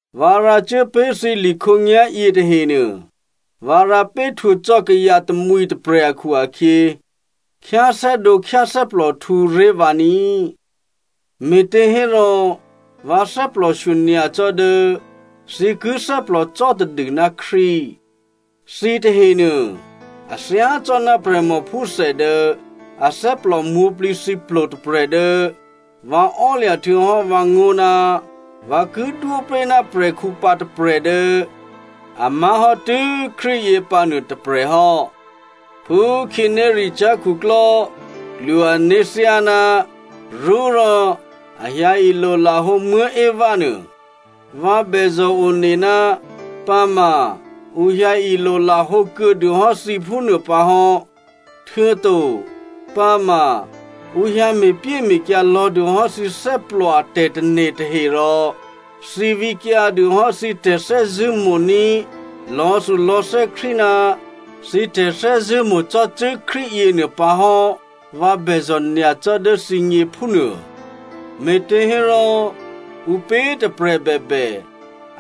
Vǎ rǎcuố pé̤ thǐ li khǒnyá̤yě tahenuô, vǎ rǎ péhtwǒ cò́ kayǎ tamwǐ tôprè̤ akhu-akhyě, khyáthè́dǒ khyáthè́plòhtǔ ré̤ vǎ ní꤮. Me̤těhérò vǎ thè́plòshyo nyacò́ dố thǐ ki thè́plòcò́ tadû ná Krístu. Thǐ tahenuô a thyácò́ná prè̤mòphúthè dố athè́plò mwǒ̤plǐthǐplo tôprè̤ dố vǎ ò́lya̤ htuô̌hò́ vǎngó̤ ná vǎ ki dwó pé̤ ná prè̤khǔ pǎ tôprè̤ dố a má̤hò́ tû́ Krístu yě pǎnuô tôprè̤ hò́. Phú khǐnéricyá̤ khuklò́ klwo ané̤ thyáná rṳ́ rò a hyǎ ilolahǒ Eva nuô, vǎ bèzò̤ one ná pǎma ǔ hyǎ ilolahǒ kuô̌dû hò́ thǐ phúnuô pǎ hò́, htuô̌to pǎma ǔ hyǎ me̤pyéme̤kyǎ lò̌dûhò́ thǐ thè́plò a tè̤tane̤ tahe rò thǐ vǐkyǎdû hò́ thǐ tè̤thè́zṳ̂́ mo̤ní̤ lò̌thulò̌thè́ Krístu ná thǐ tè̤thè́zṳ̂́mo̤ cò́cû́ Krístu yěnuô pǎ hò́ vǎ bèzò̤ nyacò́ dố thǐgně phúnuô. Me̤těhérò ǔpě tôprè̤ bèbè,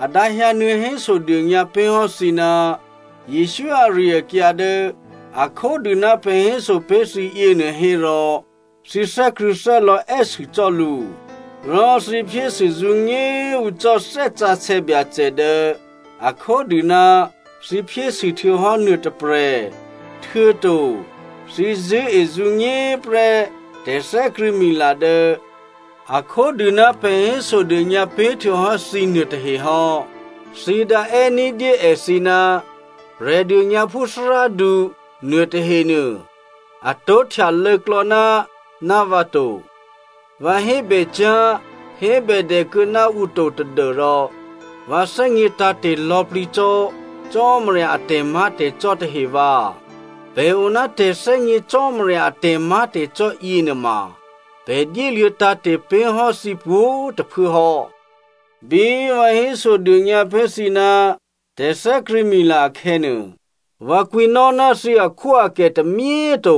a dǎhyǎnuô̌ hésodônyǎ pé̤ hò́ thǐ ná Jesǔ ari-akyǎ dố a khódû ná pè̤ héso pé̤ thǐ yěnuô hérò thǐ thè́krṳ̂̌thè́lò̌ è́sû cò́ lǔ. Rò thǐ phyésû zǔnyé꤮ hu cò́ Thè́ Sǎsè̌ Byacè dố a khódû ná thǐ phyésû htuô̌hò́ nuô tôprè̤, htuô̌to thǐ zṳ̂́ezǔnyé prè́ tè̤thè́krṳ̂̌mila dố a khódû ná pè̤ hésodônyǎ pé̤ htuô̌hò́ thǐ nuôtahe hò́. Thǐ dǎ è́ ní̤dyé èthǐ, “Prè̤dônyǎphú thárádu” nuôtahenuô, a tó̤ htyalô̌klò̌ náná vǎ to. Vǎ hébècyá̤ hébèdè kuô̌ ná ǔ to tadû́rò vǎ thè́gně tǎ̤te̤ lò̌plǐ cò́ Cò́marya a tè̤má̤tè̤cò́ tahe vǎ. Pè̤ o ná tè̤thè́gně Cò́marya a tè̤má̤tè̤cò́ yěnuôma pè̤ dyéluô̌ tǎ̤te̤ pé̤ hò́ thǐ pwǒ̤꤮ tôphuố hò́. Bí vǎ hésodônyǎ pé̤ thǐ ná tè̤thè́krṳ̂̌mila akhè̌nuô, vǎ kwǐnò́ ná thǐ akhwóakè tômyé꤮ to.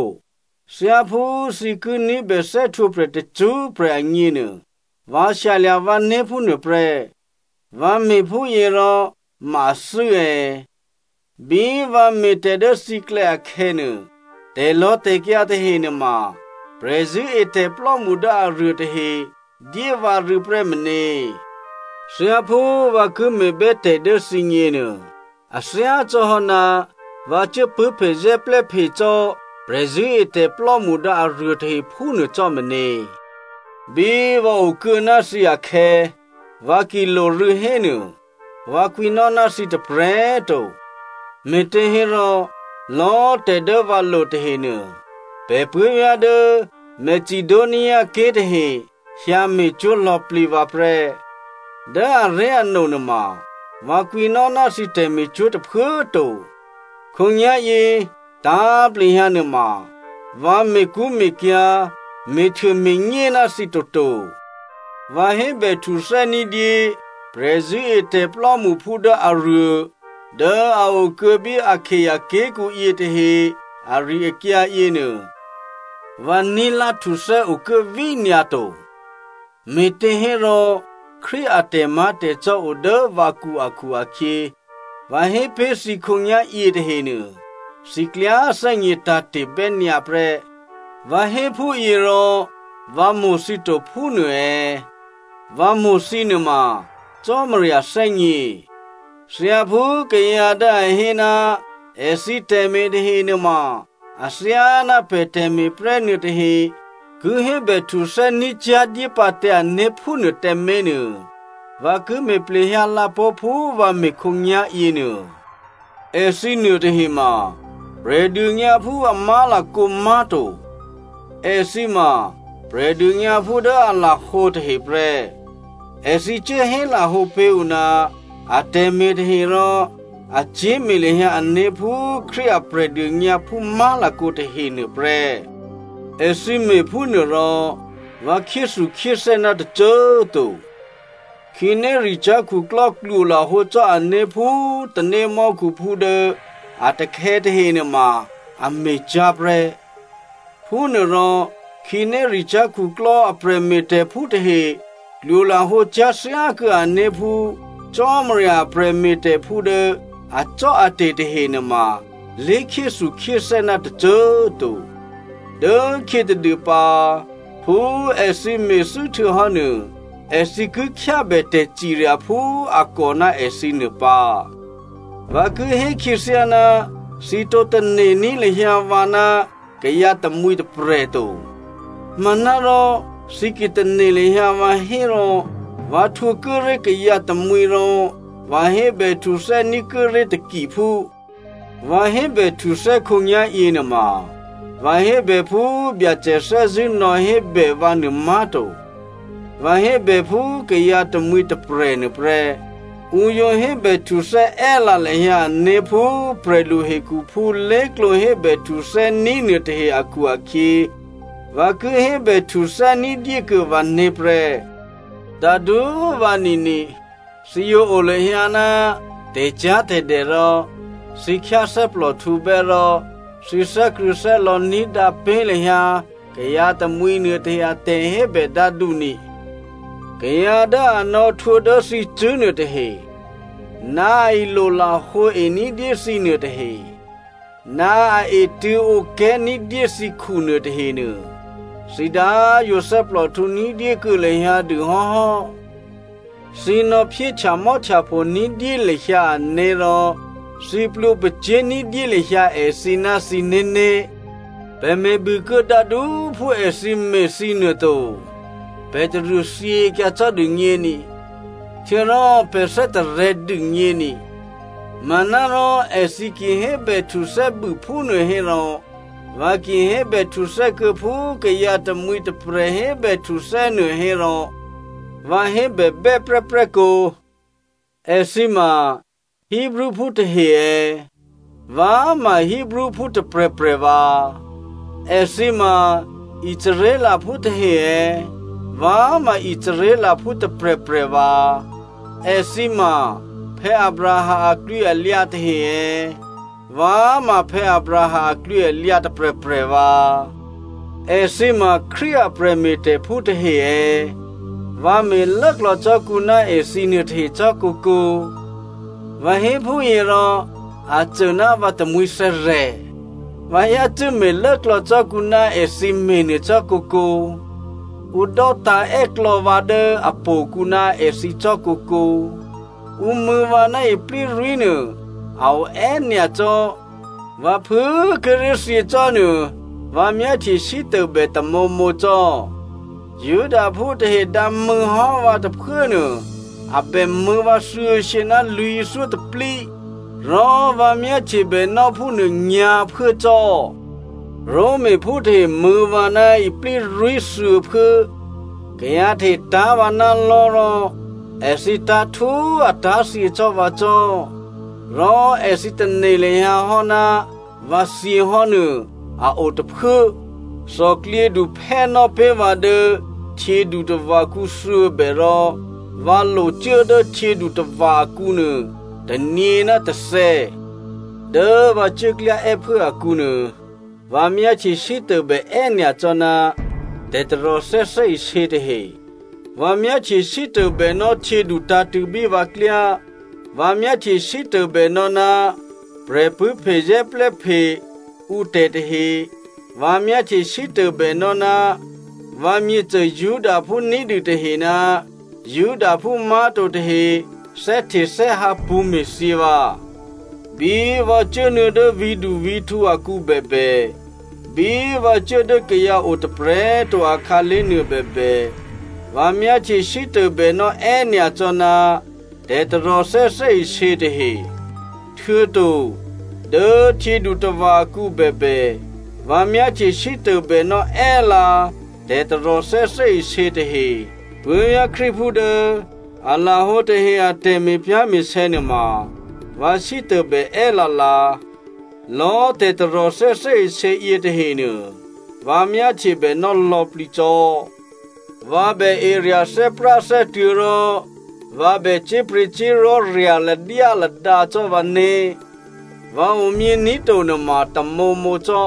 Thyáphú thǐ ki ní̤bè thè́htwǒprè̤ tacṳ́prè̤ agněnuô, vǎ shyalya̤ vǎné̤ phúnuô prè́. Vǎ me̤phúyěrò ma athû́ è̌? Bí vǎ me̤tè̤ dố thǐklè̌ akhè̌nuô, tè̤lò̌tè̤kyǎ tahe nuôma prè̤zṳ̂́etè̤plò́mṳ dố aruô tahe dyé vǎ rû̌ prè́ meně. Thyáphú vǎ ki me̤bè́tè̤ dố thǐgněnuô, a thyácò́hò́ ná vǎ cuố pṳ̂́phezè́plè́phe cò́ prè̤zṳ̂́etè̤plò́mṳ dố aruô tahe phúnuô cò́ meně. Bí vǎ okuô̌ ná thǐ akhè̌, vǎ ki lorû̌ hénuô, vǎ kwǐnò́ ná thǐ tôprè̤꤮ to, me̤těhérò lò̌꤮ tè̤ dố vǎ lo tahenuô, pè̤ puố̤vyá̤ dố Macedoniaké̤ tahe hyǎ me̤cwó̤ lò̌plǐ vǎ prè́. Dố aré̤ano nuôma vǎ kwǐnò́ ná thǐ tè̤me̤cwó̤ tôphuố꤮ to, khǒnyá̤yě tǎ̤plehyǎ nuôma꤮ vǎ me̤kṳ́me̤kyǎ̤, me̤htuôme̤nyé ná thǐ toto. Vǎ hébèhtuthè́ ní̤dyé prè̤zṳ̂́etè̤ plò́mṳphú dố aruô dố a o kuô̌ bí Akaia ké̤kǔ yětahe ari-akyǎ yěnuô, vǎ ní̤lá htuthè́ okuố vínyǎ to. Me̤těhérò Krístu a tè̤má̤tè̤cò́ o dố vǎkǔ akhu-akhyě, vǎ hé pé̤ thǐ khǒnyá̤ yětahenuô, thǐ klyá thè́gnětǎ̤te̤ bè́nyǎ prè́. Vǎ hé phúyěrò vǎ mo̤ thǐ to phúnuô è̌? Vǎ mo̤ thǐ nuôma Cò́marya thè́gně. Thyáphú kayǎ dố a hé ná èthǐ tè̤me̤ tahe nuôma athyáná pè̤ tè̤me̤ prè́ nuôtahe ki hébèhtuthè́ ní̤cyá̤ dyépǎ tǎ ané̤ phúnuô tǎmé̤ nuô, vǎ ki me̤ plehyǎ lǎ pó̤ phú vǎ me̤ khǒnyá̤ yěnuô. Èthǐ nuôtahe ma Prè̤dônyǎphú a má̤lakǒ má̤to. Èthǐ ma Prè̤dônyǎphú dố a lahǒ tahe prè́. Èthǐ cuố hélahǒ pé̤ ǔ ná atè̤me̤ tahe rò a cyé̤me̤ lahyǎ ané̤ phú Krístu a Prè̤dônyǎphú má̤lakǒ tahenuô prè́. Èthǐ me̤phúnuô rò vǎ khyéthukhyéthè́ ná tôcô꤮ to. Khǐnéricyá̤ khuklò́ klwolahǒ cò́ ané̤ phú tanémò́khuphú dố a takhè̌ tahenuô ma꤮ a me̤cyá̤ prè́. Phúnuôrò, khǐnéricyá̤ khuklò́ a prè̤me̤tè̤phú tahe klwo lahǒcyá̤ thyákuô̌ ané̤ phú Cò́marya a prè̤me̤tè̤phú dố acò́ate̤ tahe nuôma lé̤khyéthukhyéthè́ ná tôcô꤮ to. Dố khyětadû pǎ, phú èthǐ me̤thû́ htuô̌hò́nuô, èthǐ ki khyábè tè̤cirya phú a kò ná èthǐ nuô pǎ. Vǎ ki hé khyěthyá, thǐ tǒ tane̤ní̤ lahyǎ vǎ ná kayǎ tamwǐ tôprè̤꤮ to. Manárò thǐ ki tane̤ lahyǎ vǎ hérò vǎ htwǒ kuốré̤ kayǎ tamwǐ rò vǎ hébèhtuthè́ ní̤ kuốré̤ takiphú. Vǎ hébèhtuthè́ khǒnyá̤yě nuôma vǎ hébè phú Byacè thè́zṳ̂́ nò̌hébè vǎnuô má̤to. Vǎ hébè phú kayǎ tamwǐ tôprè̤ nuôprè́. Ǔ yǒ hébèhtuthè́ è́lǎ lahyǎ ǔné̤ phú prè̤lu hekhuphú lé̤klǒ hébèhtuthè́ ní̤ nuôtahe akhu-akhyě, vǎ ki hébèhtuthè́ ní̤dyé kuô̌ vǎné̤ prè́. Dǎdú꤮ vanini, thǐ yǒ o lahyǎ ná tè̤cyá̤tè̤dè rò thǐ khyáthè́plòhtǔbè́ rò thǐ thè́krṳ̂̌thè́lò̌ ní̤dǎ pé̤ lahyǎ kayǎ tamwǐ nuôtahe a tè̤hébè dǎdu ni. Kayǎ dố a nò̌htwǒ dố thǐcṳ̂́ nuôtahe, ná a ilolahǒ ení̤dyé thǐ nuôtahe, ná a etṳ̂̌ǒplè ní̤dyé thǐkhu nuôtahenuô, thǐ dǎ꤮ yǒ thè́plòhtǔ ní̤dyé kuô̌ lahyǎ dû hò́hò́. Thǐ nò̌phyé htyamò́htyapho ní̤dyé lahyǎ ané̤ rò thǐ plwǒ pacyé̤ ní̤dyé lahyǎ èthǐ ná thǐné̤né̤. Pè̤ me̤bûkuô̌ dǎdú꤮ phú èthǐ me̤ thǐ nuô to, pè̤ taruô thyěkyǎ cò́dû gněni, htuô̌rò pè̤ thè́tarè̤̌ dûgně ni. Manárò èthǐ ki hébèhtuthè́ bû phúnuô hérò vǎ ki hébèhtuthè́ kuô̌ phú kayǎ tamwǐ tôprè̤ hébèhtuthè́ nuô hérò vǎ hébèbè́ prè́prè́ kǒ. Èthǐ ma Hebreophú tahe è̌? Vǎ ma Hebreophú tôprè̤prè̤ vǎ. Èthǐ ma Israelphú tahe è̌? Vǎ ma Israelphú tôprè̤prè̤ vǎ. Èthǐ ma Abraham aklwǐalyǎ tahe è̌? Vǎ ma Abraham aklwǐalyǎ tôprè̤prè̤ vǎ. Èthǐ ma Krístu a prè̤me̤tè̤phú tahe è̌? Vǎ me̤ lốklò̌ cò́ kǔ ná èthǐ nuôtahe cò́ kǒkǒ. Vǎ hé phúyě rò a cô ná vǎ tamwǐthè̌rè̤. Vǎ yácû́ me̤ lốklò̌ cò́ kǔ ná èthǐ me̤nuô cò́ kǒkǒ, ǔ dò́tǎ̤ è́klò̌ vǎ dố htò̌kǔ ná èthǐ cò́ kǒkǒ. Ǔ mṳ̂̌ vǎ ná iplírwí̤ nuô a o è́nyacò́, vǎ phû꤮ kíré̤ thyěcò́nuô vǎ myáhtye sítôbè tamǒmǒ cò́. Judaphú tahe dǎmṳ̂̌ hò́ vǎ tôphuốnuô a bèmṳ̂̌ vǎ thuô̌shyě ná lwǐ̤thyótôplí, rò vǎ myáhtyebè nò́ phúnuô nyǎ̤phuố cò́. Romaphú tahe mṳ̂̌ vǎ ná iplírwí̤ thuô̌phuố, kayǎ tahe tá̤ vǎ ná lò̤́ rò èthǐ tá̤ htú꤮ a tá̤thyě cò́ vǎ cò́, rò èthǐ tane̤ lahyǎ hò́ ná vǎ thyěhò́nuô, a o tôphuố. Thòklyědu phè́ nò́ pé̤ vǎ dố htyědutava̤kǔ thuô̌bè rò vǎ locuố dố htyědutava̤ akǔnuô tônyě ná tôthè̌. Dố vǎ cuố klyá è́phuố akǔnuô vǎ myáhtye sítôbè è́nyacò́ ná tè̤taròthè́ thè́isě tahe. Vǎ myáhtye sítôbè nò́ htyědu tǎ̤tṳ̂̌bí vǎklyá, vǎ myáhtye sítôbè nò́ ná prè̤pṳ̂́phe zè́plè́phe ǔtè̤ tahe, vǎ myáhtye sítôbè nò́ ná vǎmyěcô Judaphú ní̤dû tahe ná Judaphú má̤to tahe thè́htethè́hǎ pṳ̌me̤thyě vǎ. Bí vǎ cuốnuô̌ dố vǐ̤duvǐ̤htǔ akǔ bèbè, bí vǎ cuố dố kayǎ o tôprè̤꤮ to akhǎlé̤ nuô bèbè, vǎ myáhtye sítôbè nò́ è́nyacò́ ná tè̤taròthè́ thè́isě tahe. Htuô̌to dố htyědutava̤ akǔ bèbè, vǎ myáhtye sítôbè nò́ è́lǎ tè̤taròthè́ thè́isě tahe. Puố̤vyá̤ Krístuphú dố a lahǒ tahe a tè̤me̤pyá̤me̤sè̌ nuôma vǎ sítôbè è́lǎ lǎ. Lò̌꤮ tè̤taròthè́ thè́isě yětahenuô, vǎ myáhtyebè nò́ lò̌plǐ cò́. Vǎ bè erya̤ thè́práthè́tuô̤̌ rò vǎ bè cyé̤pryě̤cyé̤li̤ rya̤ ladyáladǎ cò́ vǎné̤. Vǎ omyění̤ to nuôma tamǒmǒ cò́.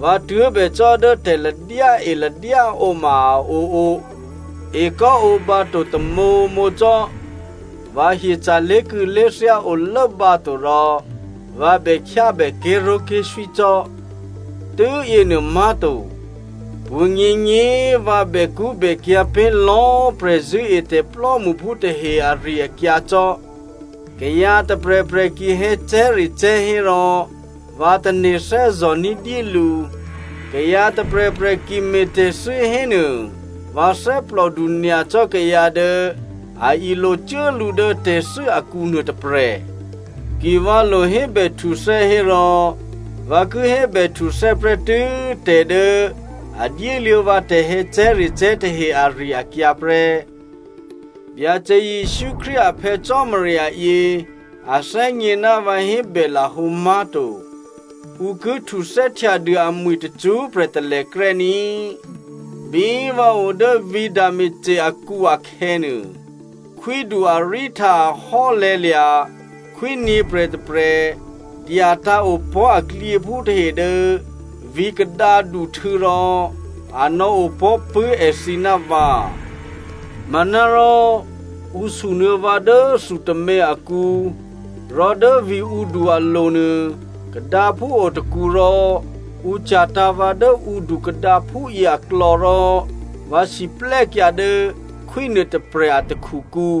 Vǎ tuố̤bècò́ dố tè̤ladyáe ladyáǒ ma a oo. Ekò́ǒbǎ to tamǒmǒ cò́. Vǎ hyeca̤ lé̤kû̌lé̤thyá o lốbǎto rò vǎ bè khyábè ké̤ró̤ké̤swí cò́. Tû́yěnuô má̤to, pwǒ̤nyěnyě꤮ vǎ bèkṳ́bèkyǎ̤ pé̤ lò̌꤮ prè̤zṳ̂́etè̤ plò́mṳphú tahe ari-akyǎ cò́. Kayǎ tôprè̤prè̤ ki hè̌cè̤́recè̤́ hérò vǎ tane̤ thè́zò̤ ní̤dyé lǔ. Kayǎ tôprè̤prè̤ ki me̤tè̤thû́ hénuô vǎ thè́plòdu nyacò́ kayǎ dố a ilocuố lǔ dố tè̤thû́ akǔ nuô tôprè̤. Ki vǎ lo hébèhtuthè́ hérò vǎ ki hébèhtuthè́ prè́tû́ tè̤ dố a dyéluô̌ vǎ tè̤hè̌cè̤́recè̤́ tahe ari-akyǎ prè́. Byacè Jesǔ Krístu a Phè̌ Cò́marya yě a thè́gně ná vǎ hébè lahǒ má̤to. Ǔ ki htuthè́htyadû amwi̤ tacṳ́prè̤ talèkrè́ ní꤮. Bí vǎ o dố vǐ̤ Damasco akǔ akhè̌nuô, khwídu Areta ahò́lè̤̌lya̤ khwí nyě̤prè̤tôprè̤ dyatǎ̤ opò̤́ aklyěphú tahe dố vǐ̤ kadǎduhtû̌ rò a nò̌opò̤́ pṳ̂́ èthǐ ná vǎ. Manárò, ǔ sunuô̌ vǎ dố thu tômě akǔ, rò dố vǐ̤ǔdu alo̤ nuô kadǎphú o tôkǔ rò ǔ cya̤tǎ̤ vǎ dố ǔdu kadǎphúyě aklò̌ rò vǎ siplè́kyǎ dố khwí nuôtôprè̤ a takhukǔ.